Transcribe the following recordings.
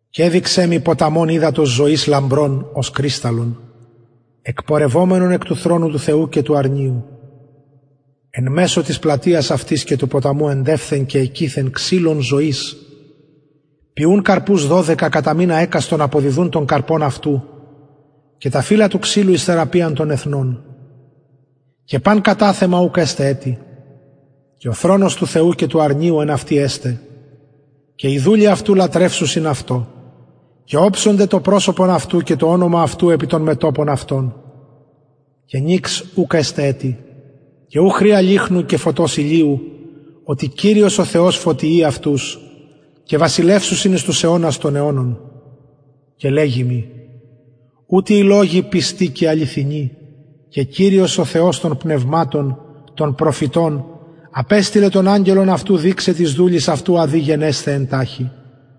και εδειξεν μοι ποταμον καθαρον υδατος ζωης λαμπρον ως κρυσταλλον εκπορευομενον εκ του θρονου του θεου και του αρνιου εν μεσω της πλατειας αυτης και του ποταμου εντευθεν και εκειθεν ξυλον ζωης ποιουν καρπους δωδεκα κατα μηνα εκαστον αποδιδους τον καρπον αυτου και τα φυλλα του ξυλου εις θεραπειαν των εθνων και παν καταθεμα ουκ εσται ετι και ο θρονος του θεου και του αρνιου εν αυτη εσται και οι δουλοι αυτου λατρευσουσιν αυτω και οψονται το προσωπον αυτου και το ονομα αυτου επι των μετωπων αυτων και νυξ ουκ εσται εκει και χρειαν ουκ εχουσιν λυχνου και φωτος ηλιου οτι κυριος ο θεος φωτιει αυτους και βασιλευσουσιν εις τους αιωνας των αιωνων και λεγει μοι ουτοι οι λογοι πιστοι και αληθινοι και κυριος ο θεος των πνευματων των προφητων απεστειλεν τον αγγελον αυτου δειξαι τοις δουλοις αυτου α δει γενεσθαι εν ταχει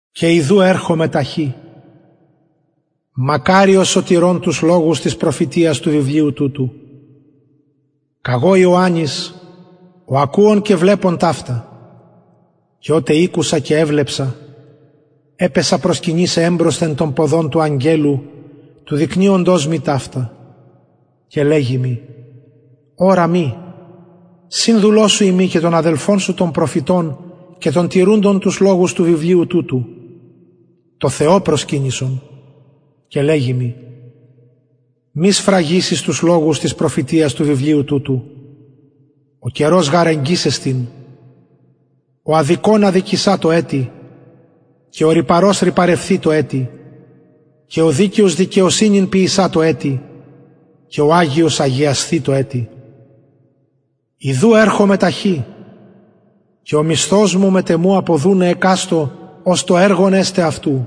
και ιδου ερχομαι ταχυ μακαριος ο τηρων τους λογους της προφητειας του βιβλιου τουτου καγω ιωαννης ο ακουων και βλεπων ταυτα και οτε ηκουσα και εβλεψα επεσον προσκυνησαι εμπροσθεν των ποδων του αγγελου του δεικνυοντος μοι ταυτα και λεγει μοι ορα μη συνδουλος σου ειμι και των αδελφων σου των προφητων και των τηρουντων τους λογους του βιβλιου τουτου τω θεω προσκυνησον και λεγει μοι μη σφραγισης τους λογους της προφητειας του βιβλιου τουτου ο καιρος γαρ εγγυς εστιν ο αδικων αδικησατω ετι και ο ρυπαρος ρυπαρευθητω ετι και ο δικαιος δικαιοσυνην ποιησατω ετι και ο αγιος αγιασθητω ετι ιδου ερχομαι ταχυ και ο μισθος μου μετ εμου αποδουναι εκαστω ως το εργον εσται αυτου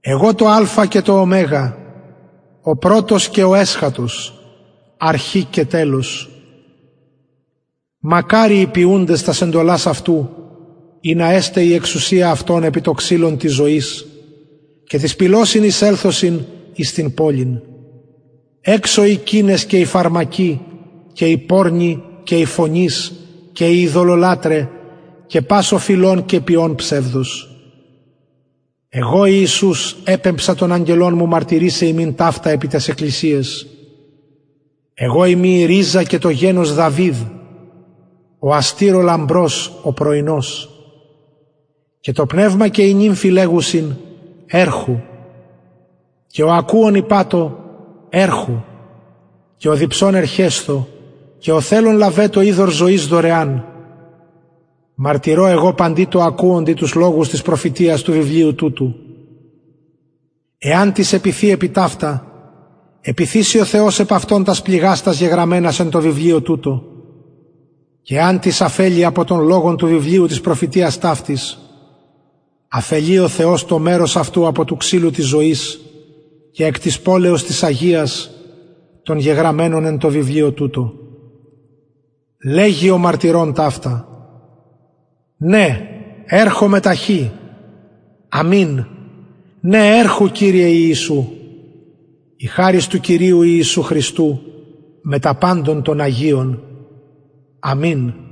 εγω το αλφα και το ω ο πρωτος και ο εσχατος η αρχη και το τελος μακαριοι οι ποιουντες τας εντολας αυτου ινα εσται η εξουσια αυτων επι το ξυλον της ζωης και τοις πυλωσιν εισελθωσιν εις την πολιν εξω οι κυνες και οι φαρμακοι και οι πορνοι και οι φονεις και οι ειδωλολατραι και πας φιλων και ποιων ψευδος εγω ιησους επεμψα τον αγγελον μου μαρτυρησαι υμιν ταυτα επι ταις εκκλησιαις εγω ειμι η ριζα και το γενος δαυιδ ο αστηρ ο λαμπρος ο πρωινος και το πνευμα και η νυμφη λεγουσιν ερχου και ο ακουων ειπατω ερχου και ο διψων ερχεσθω ο θελων λαβετω υδωρ ζωης δωρεαν μαρτυρω εγω παντι τω ακουοντι τους λογους της προφητειας του βιβλιου τουτου εαν τις επιθη επ αυτα επιθησαι ο θεος επ αυτον τας πληγας τας γεγραμμενας εν τω βιβλιω τουτω και εαν τις αφελη απο των λογων του βιβλιου της προφητειας ταυτης αφελοι ο θεος το μερος αυτου απο του ξυλου της ζωης και εκ της πολεως της αγιας των γεγραμμενων εν τω βιβλιω τουτω λεγει ο μαρτυρων ταυτα ναι ερχομαι ταχυ αμην ναι ερχου κυριε ιησου η χαρις του κυριου ιησου χριστου μετα παντων των αγιων αμην